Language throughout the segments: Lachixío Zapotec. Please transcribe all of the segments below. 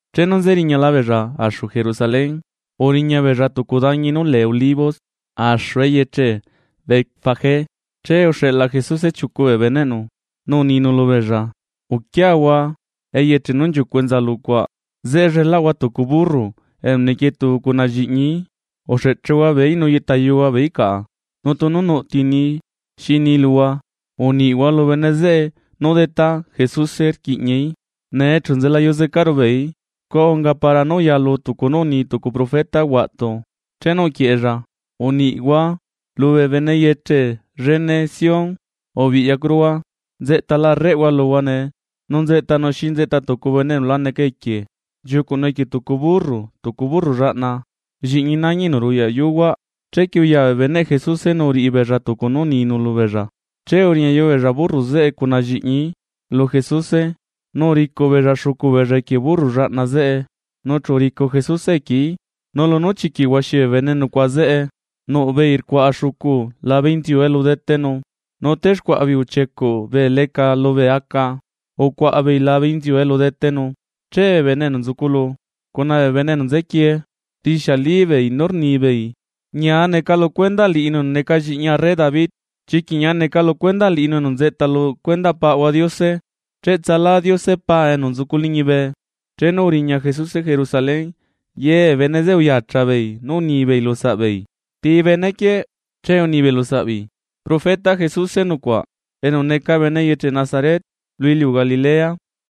Chenu nzeriñala beella axu Jerusalén, uriña beella tucu dañi nú lee Olivos, axu eyeche Betfagé, che uxeꞌla Jesuse chiucu bee beneꞌnu, nu uninu lubeella: ―Uquiahua eyeche nú nchiucuꞌ enza lucuaꞌ. Zeꞌe llelaꞌhua tucu burro enu nequietu cuna lliꞌñií. Uxeꞌchehua beeí nu yeꞌtayuhua beeí caꞌa. Nu tunu nuꞌ ti ni xi ni luhua, uniꞌhua lu bene zeꞌe nú Detá, Jesuse rquiꞌñaí, nee chu nzelayuzecaru beeí. Scua unga para nú uyalu tucu nú uni tucu profeta huaꞌtu, chenu uquieꞌella: Uniꞌhua lubee bene eyeche llene Sión: “Ubiꞌyacuruhua, nzeꞌtala arréꞌhua luhua nee, nu nzeꞌtanu xi nzeꞌta tucu bene enu la neca equie, nchiucuꞌnu equie tucu burru, tucu burro llaꞌna, lliꞌñi nañi enu ruyaꞌ yuhuaꞌ.” Chequie uya bee beneꞌ Jesuse nu uriꞌi beella tucu nú uninu lubeella. Che uriñayu beella burro zeꞌe cuna lliꞌñií lu Jesuse, nu uricuꞌ beella xucu beella equie burro llaꞌna zeꞌe, nu chu uricu Jesuse equieí. Nu lunú chiquiꞌ huaxi bee bene nucuaꞌa zeꞌe, nuꞌ beei rcuaꞌa xucu labe inziu elu detenu, nu texcuaꞌa beei uchiecuꞌ bee leca lubee aca ucuaꞌa beei labe inziu elu detenu. Che bee bene enu nzuculu, cuna bee bene enu nzequie, rixiali beei nú rnibeei: ―¡Ñia neca lu cuendaꞌ liꞌinu enu neca Lliꞌñi arre David! ¡Chiquiꞌ ñia neca lu cuendaꞌ liꞌinu enu nzeꞌta lu cuendaꞌ Paꞌahua Diose! ¡Cheꞌtsalá Diose Paa enu nzucu liñibe! Chenu uriña Jesuse Jerusalén, ye bee bene zeꞌe uyacha beei nu unibeei lu saꞌbeei: ―¿Ti bene quieꞌ? Che unibeei lusaꞌbeei: ―Profeta Jesuse nucuaꞌ, enu neca bene eyeche Nazaret lu iliu Galilea.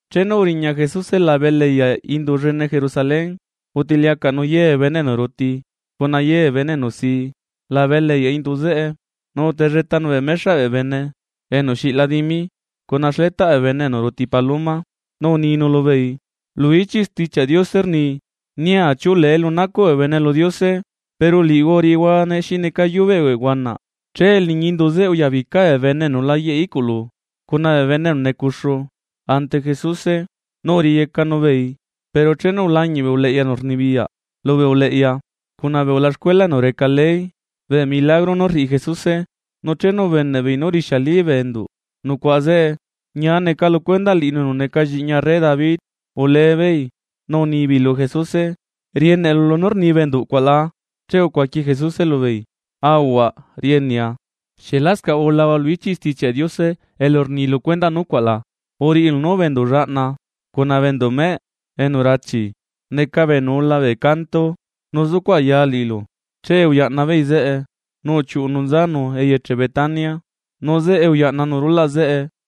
Chenu uriña Jesuse labe eleꞌyaꞌ indu llene Jerusalén utiliacaꞌnu ye bee bene enu ruti cuna ye bee bene enu si labe eleꞌyaꞌ indu zeꞌe. Nu utelletanu bee mexaꞌ bee bene enu xiꞌla dimi, cuna xletaꞌ bee bene enu ruti bee paloma, nu uninu lubeei: ―Lu ichiꞌ Stichiaꞌ Diose rni: “Nia chiulee niꞌi elu nacuꞌ bee bene lu Diose”, pero liꞌihua uriꞌihuane xi neca yubeꞌ bee huanaꞌ. Che liñi indu zeꞌe uyabica bee bene enu la yeꞌe iꞌculu cuna bee bene enu necuxu ante Jesuse, nu uriyecanu beei. Pero chenu ulañiꞌ bee uleꞌya enu rnibiyaꞌ lubee uleꞌya cuna bee ulaxcuela enu reca ley bee milagro nú rriꞌi Jesuse, nu chenu ubeneꞌ beei nú rixiali bee enduꞌ nucuaꞌ zeꞌe: “¡Ñia neca lu cuendaꞌ liꞌinu enu neca Lliꞌñi arre David!”, ule beei nu unibeei lu Jesuse: ―¿Rieneꞌlu nú rni bee enduꞌ cuaꞌ la? Che ucuaqui Jesuse lubeei: ―Aahuaꞌ, rienea. Pero ¿xieꞌ lascaꞌ ulahua lu ichiꞌ Stichiaꞌ Diose elu rni lu cuendaꞌ nucuaꞌ la? Lu ichiꞌ Stichiaꞌ Diose rni: Uriꞌilu nú bee enduꞌ llaꞌna cuna bee enduꞌ meꞌe enu rachi, neca bee enu ula bee canto nu zucuꞌ aya liꞌilu. Che uyaꞌna beei zeꞌe, nu uchiuꞌunu nzanu eyeche Betania, nu zeꞌe uyaꞌnanu rulaꞌ zeꞌe.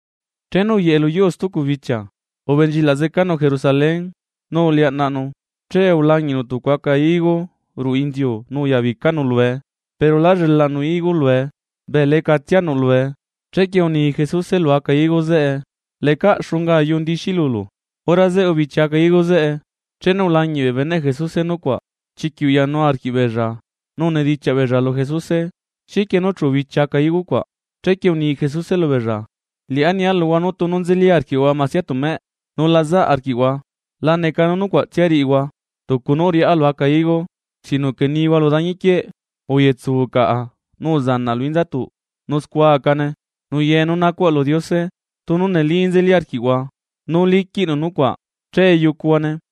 Chenu uyeꞌe lu yuu stucu bichia, ubenchilaꞌ zecanu Jerusalén, nu uliaꞌnaꞌnu. Che ulañiꞌnu tucu aca higo ruꞌu inziu nu uyabicanu lue. Pero lá llelaꞌnu higo lue, bee lecatsia nuꞌlue. Chequie uni Jesuse lu aca higo zeꞌe: ―¡Lecaꞌ xunga ayu ndixi lulu! Hora zeꞌe ubichi aca higo zeꞌe. Chenu ulañiꞌ bee beneꞌ Jesuse nucuaꞌ, chiquiꞌ uyanu arquiꞌbeella nu unidichiaꞌ beella lu Jesuse: ―¿Xiquie nú chu ubichi aca higo cuaꞌ? Chequie uni Jesuse lubeella: ―Liꞌá nia luhua nú tunu nzeli arquiꞌhua masia temeꞌ, nu la zaꞌ arquiꞌhua, la neca nú nucuaꞌtsia riꞌihua tucu nú uriꞌá lu aca higo, sino que nihua lu dañiquieꞌ: “Uyetsu caꞌa nu uzanaꞌ lu inzatuꞌ”, nu scua acane. Nu ye nú nacuꞌhua lu Diose, tunu neli nzeli arquiꞌhua nú liquiꞌnu nucuaꞌ, che yucuhuane.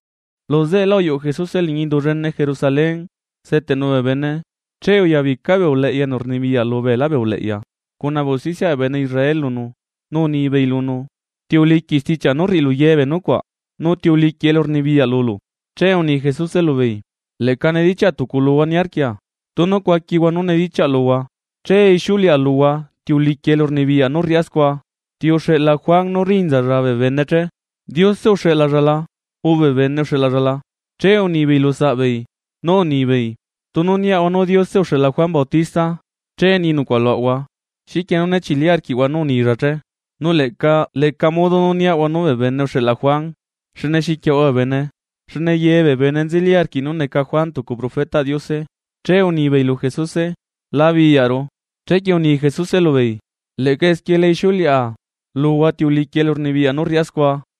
Luzeꞌelá uyuꞌu Jesuse liñi indu llene Jerusalén seteꞌnu bee bene, che uyabica bee uleꞌya enu rnibiyaꞌ lubeelá bee uleꞌya cuna bee usticiaꞌ bee bene Israel lunu, nu unibeei lunu: ―¿Ti uliquiꞌ stichiaꞌ nú rriꞌilu ye bee nucuaꞌ?, nu ¿Ti uliquiꞌ elurnibiyaꞌ lulu? Che uni Jesuse lubeei: ―Leꞌca nedichiaꞌa tucu luhua niarquia, tunu cuaquihua nú nedichiaꞌ luhua, che ixiuleꞌa luhua ti uliquiꞌ elurnibiyaꞌ nú rriꞌá scua. ¿Ti uxeꞌla Juan nú rinzalla bee bene che? ¿Diose uxeꞌlalla la o bee bene uxeꞌlalla la? Che unibeei lusaꞌbeei, nú unibeei: ―Tunu niaꞌahua nú Diose uxeꞌla Juan Bautista, che ni nucuaꞌ luaꞌahua: “¿Xiquie nú né chili arquiꞌhua nú unilla che?” Nu leꞌca leca modo niaꞌahua nú bee bene uxeꞌla Juan, xne xiquiaꞌahua bee bene, xne ye bee bene nzeli arquiꞌ nú neca Juan tucu profetaꞌ Diose. Che unibeei lu Jesuse: ―Labiyaꞌru. Chequie uni Jesuse lubeei: ―Leꞌca esquie la ixiuleꞌa luhua ti uliquiꞌ elurnibiyaꞌ nú rriꞌá scua.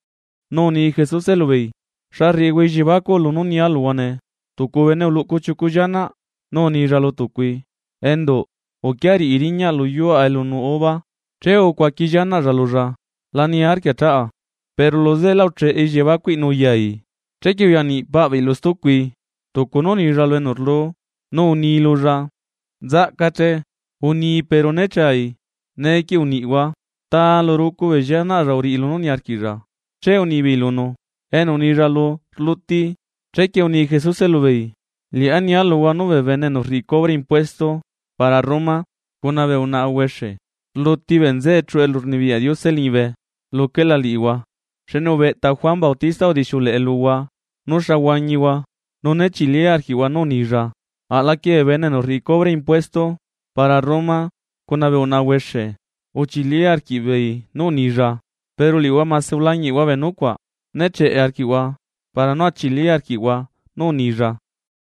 Nu uni Jesuse lubeei: ―¿Xa rriꞌihua elliebacuꞌ lunú nia luhua nee? Tucu bene uluꞌcu chiucu llianaꞌ, nu unilla lu tucui: “Enduꞌ, uquia riꞌi riñaꞌ lu yuua elu nuꞌ uva.” Che ucuaqui llianaꞌlla lulla: “¡La niarquia chaꞌa!” Pero luzeꞌelá ucheꞌe elliebacuꞌi nu uyai. Chequie uya niꞌ paꞌ beei lu stucui, tucu nú unilla lu enu rlu, nu uni lulla: “Nzaꞌca che.” Uni, pero né chai. Neequie uniꞌhua, ¿ta lu rucu bee llianaꞌlla uriꞌi lunú niarquiꞌlla? Che unibeei lunu: ―Enu unilla lu rluti. Chequie uni Jesuse lubeei: ―Liꞌá nia luhua nú bee bene enu rriꞌi cubre impuesto para Roma, cuna bee unaꞌa huexe rluti bee nzeꞌe chuꞌu elurnibiyaꞌ Diose liñibe luquela liꞌihua. Xne ubeꞌta Juan Bautista udixiuleꞌe luhua nú xa huañihua, nu né chili arquiꞌhua nú unilla, aꞌlaquie bee bene enu rriꞌi cubre impuesto para Roma cuna bee unaꞌa huexe uchilí arquiꞌbeei nú unilla. Pero liꞌihua mase ulañiꞌhua bee nucuaꞌ, ne cheꞌe arquiꞌhua, para nú a chili arquiꞌhua nú unilla.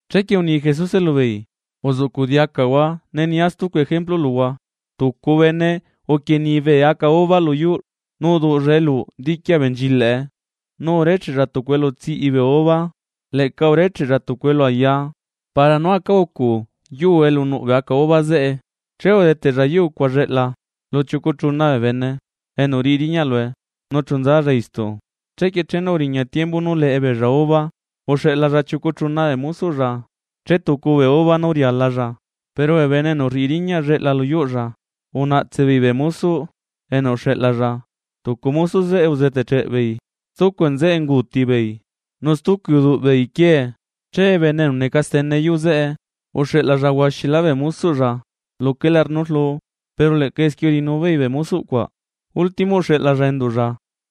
’Chequie uni Jesuse lubeei uzuꞌcuꞌ diacahua ne nia stucu ejemplu luhua: Tucu bene uquieni bee aca uva lu yuuꞌ, nu uduꞌlla eluꞌu diqui abenchilaꞌe, nu urecheꞌlla tucu elu tsiꞌi bee uva, leꞌca urecheꞌlla tucu elu aya para nú aca ucu yuu elu nuꞌ bee aca uva zeꞌe. ’Che udeteꞌlla yuu cuaꞌ lleꞌla lu chiucu chuna bee bene enu riꞌi riñaꞌ lue, nu chu nzalla istu. Chequie chenu uriña tiembu nú leꞌe beella uva, uxeꞌlalla chiucu chuna bee mosoꞌlla chetucu bee uva nú rialalla. Pero bee bene enu rriꞌi riñaꞌ lleꞌla lu yuuꞌlla unaꞌtse beei bee mosoꞌ enu uxeꞌlalla, tucu mosoꞌ zeꞌe uzeteꞌcheꞌ beei, stucu nzeꞌe unguuti beei, nu stucui uduꞌ beei quiee. Che bene enu neca stene yuu zeꞌe, uxeꞌlaꞌlalla huaxilá bee mosoꞌlla luquela nú rlu, pero leꞌca esquie uriꞌinu beei bee mosoꞌ cuaꞌ. ’Último uxeꞌlalla enduꞌlla,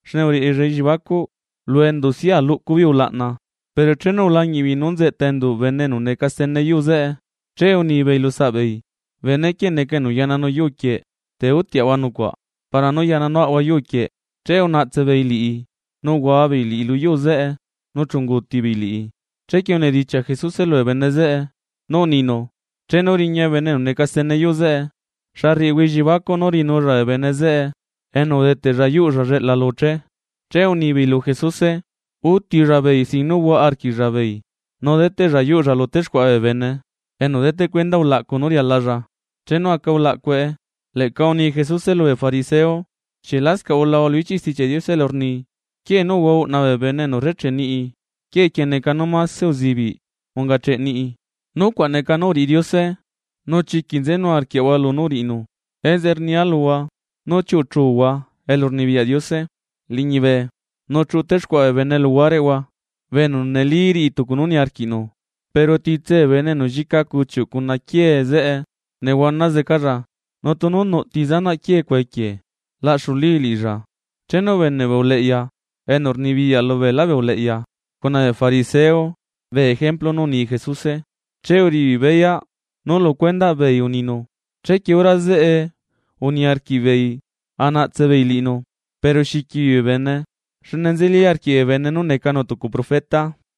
xne uriꞌilla elliebacuꞌ: “Lu endusia luꞌcu beei ulaꞌna.” Pero chenu ulañiꞌ beei nú nzeꞌta enduꞌ bene enu neca stene yuu zeꞌe, che unibeei lusaꞌbeei: “Bene quieꞌ neca enu yaꞌnanu yuu quieꞌ, te utiaꞌhua nucuaꞌ para nú yaꞌnanuaꞌahua yuu quieꞌ.” Che unaꞌtse beei liꞌi, nu uhua beei liꞌi lu yuu zeꞌe nu chu unguuti beei liꞌi. Chequie unedichiaꞌ Jesuse lubee bene zeꞌe nú uninu: ―Chenu riña bene enu neca stene yuu zeꞌe, ¿xa rriꞌihua elliebacuꞌ nú riꞌinulla bee bene zeꞌe enu udeteꞌlla yuuꞌlla lleꞌla lu che? Che unibei lu Jesuse: ―Utilla beei sin nú huaꞌa arquiꞌlla beei, nu deteꞌlla yuuꞌlla lu texcuaꞌa bee bene, enu deteꞌ cuenda ulaꞌcu nú rialalla chenu aca ulaꞌcue. Leꞌca uni Jesuse lubee fariseo: ―¿Xieꞌ lascaꞌ ulahua lu ichiꞌ Stichiaꞌ Diose elu rni? Quiee nú uhua uꞌna bee bene enu rrecheꞌ niꞌi, quiee quieꞌ neca nú mase uzibiꞌ ungacheꞌ niꞌi. Nucuaꞌ neca nú uriꞌi Diose, nu chiquiꞌ nzenu arquiaꞌahua lunú uriꞌinu. Enzeꞌe nia luhua nú chiuꞌuchuhua elurnibiyaꞌ Diose liñibe nu chuꞌu téxcuaꞌa bee bene luhuareꞌhua, bee enu neli riꞌi tucu nú niarquiꞌnu. Pero titse bee bene enu llica cuchiuꞌ cuna quiee zeꞌe, nehuana zecalla, nu tunu nuꞌti zanaꞌ quiee cuaꞌ equie laꞌxulii liꞌilla. Chenu ubeneꞌ bee uleꞌya enu rnibiyaꞌ lubeelá bee uleꞌya cuna bee fariseo bee ejemplu nú uni Jesuse, che uriꞌi beei beyaꞌ nú lu cuendaꞌ beei uninu. Chequie hora zeꞌe uniarquiꞌ beei a naꞌtse beei liꞌinu, pero xiqui beei bee bene, xne nzeli arquiꞌ bee bene nú necanu tucu profeta.